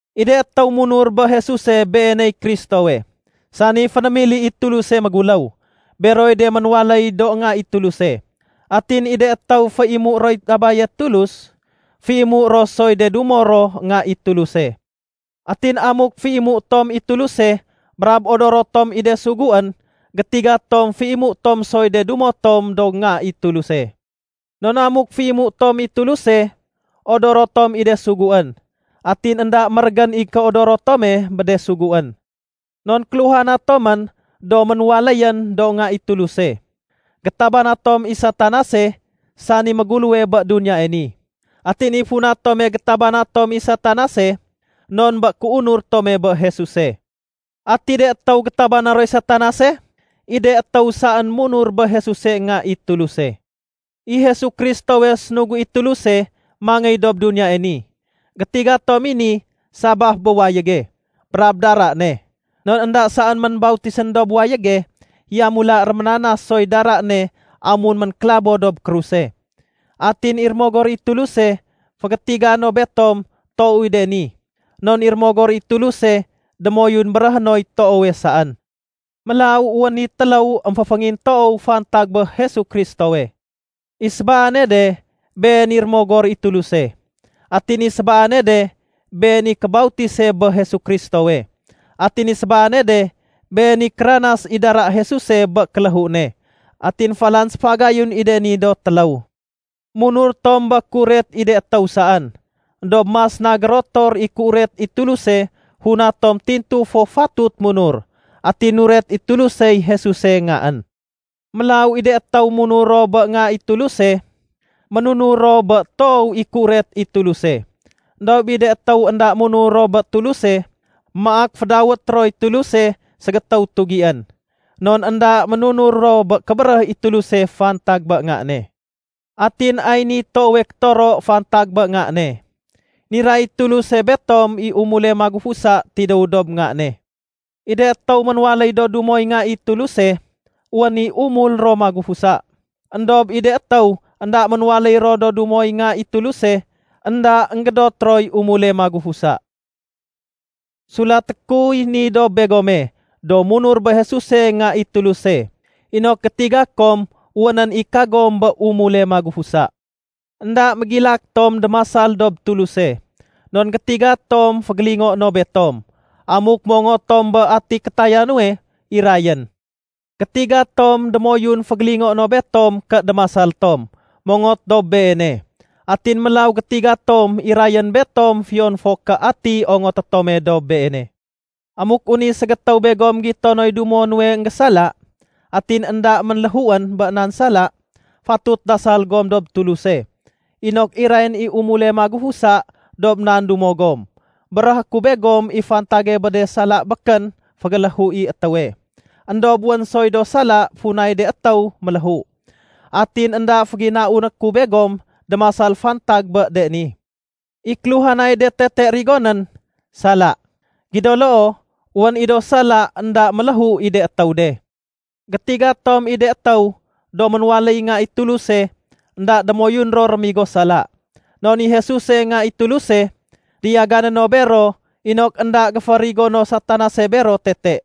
I de étéw munur bé Jesuse Beeney Kristowe, sani fénémili i Tuluse méguléw, beroy de ménwaléy do nga i Tuluse. Atin i de étéw féimué roy Abaye Tulus, féimué ro soy de dumo ro nga i Tuluse. Atin amuk féimué tom i Tuluse brab odoro tom i de suguén, gétiga tom féimué tom soy de dumo tom do nga i Tuluse. Non amuk féimué tom i Tuluse, odoro tom i de suguén. Atin énda mérégén i kéodoro tome bé de suguén. Non kéluhana tomén do ménwaléyén do nga i Tuluse, gétabana tom i Satanase, sani méguléwe bé duniyae ni. Atin i funa tome gétabana tom i Satanase non bé kéunur tome bé Jesuse. Ati de étéw gétabana roy Satanase? I de étéw saén munur bé Jesuse Nga i Tuluse. I Jesu Kristowe sénugu i Tuluse mangéy dob duniyae ni. Gétiga tom i ni sabaf bé wayége brab dara ne. Non énda saén ménbautisén dob wayége, yamula réménanas soy dara ne amun ménkélabo dob kruse. Atin i Rémogor i Tuluse fégétiga no betom toow i de ni, non i Rémogor i Tuluse démoyun béréhé noy toowe saén. Mélaw wén i téléw émféféngintoow fantag bé Jesu Kristowe: I sébaane de, been i Rémogor i Tuluse. Atin i sébaane de, been i kébautise bé Jesu Kristowe. Atin i sébaane de, been i kéranas i dara Jesuse bé kéléhu ne. Atin falan séfagayun i de ni do téléw. Munur tom bé kéuret i de étéw saén, éndob mas na gérotor i kéuret i Tuluse funa tom tintu fo fatut munur. Atin nuret i Tulusey Jesuse Ngaén. Mélaw i de étéw munur ro bé Nga i Tuluse, ménunur ro bé toow i kéuret i Tuluse. Endob i de étéw énda munur ro bé Tuluse, maak fédawét roy Tuluse ségétéw tugién. Non énda ménunur ro bé kébéréh i Tuluse fantag bé Nga ne. Atin ay niy toowe kétoro fantag bé Nga ne. Niray i Tuluse betom i umule magufusa tidéw dob Nga ne. I de étéw ménwaléy do dumoy Nga i Tuluse, wén i umul ro magufusa. Endob i de étéw énda ménwaléy ro do dumoy Nga i Tuluse, énda énggédot roy umule magufusa. Sulaté kuy ni dob begome do munur bé Jesuse Nga i Tuluse inok gétiga kom wénén i kagom bé umule magufusa. Enda mégilak tom démasal dob Tuluse non gétiga tom fégélingoé no betom amuk mongot tom bé ati kétaya nuwe irayén. Gétiga tom démoyun fégélingoé no betom ké démasal tom mongot dob Beene. Atin mélaw gétiga tom irayén betom fiyon fo ké ati ongoté tome dob Beene. Amuk wén i ségétéw begom gito noy dumo nuwe énggésala, atin énda ménléhuén bé nan sala, fatut dasal gom dob Tuluse inok irayén i umule magufusa dob nan dumo gom. Béréhé ku begom i fantage bé de sala békén fégéléhu i étéwe. Endob wén soy do sala funay de étéw méléhu. Atin énda féginauné ku begom démasal fantag bé de ni. I kéluhanay de tete rigonén, sala. Gido loo, wén i do sala énda méléhu i de étéw de. Gétiga tom i de étéw do ménwaléy nga i Tuluse énda démoyun ro rémigo sala. Non i Jesuse Nga i Tuluse, diyagané no bero inok énda géférigono Satanase bero tete.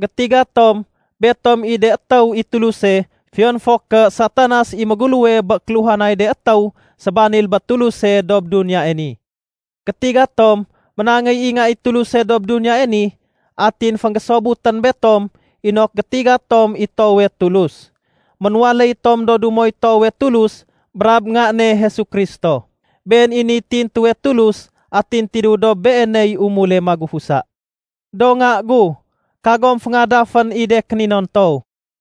Gétiga tom betom i de étéw i Tuluse fiyon fo ké Satanas i méguléwe bé kéluhanay de étéw sébanil bé Tuluse dob duniyae ni. Gétiga tom ménangéy i Nga i Tuluse dob duniyae ni, atin fénggésobutén betom inok gétiga tom i toowe Tulus. Ménwaléy tom do dumoy toowe Tulus brab Nga ne Jesu Kristo. Been i niy tintuwe Tulus atin tidéw dob Beeney umule magufusa. Do nga gu, kagom féngadafén i de kéninontow.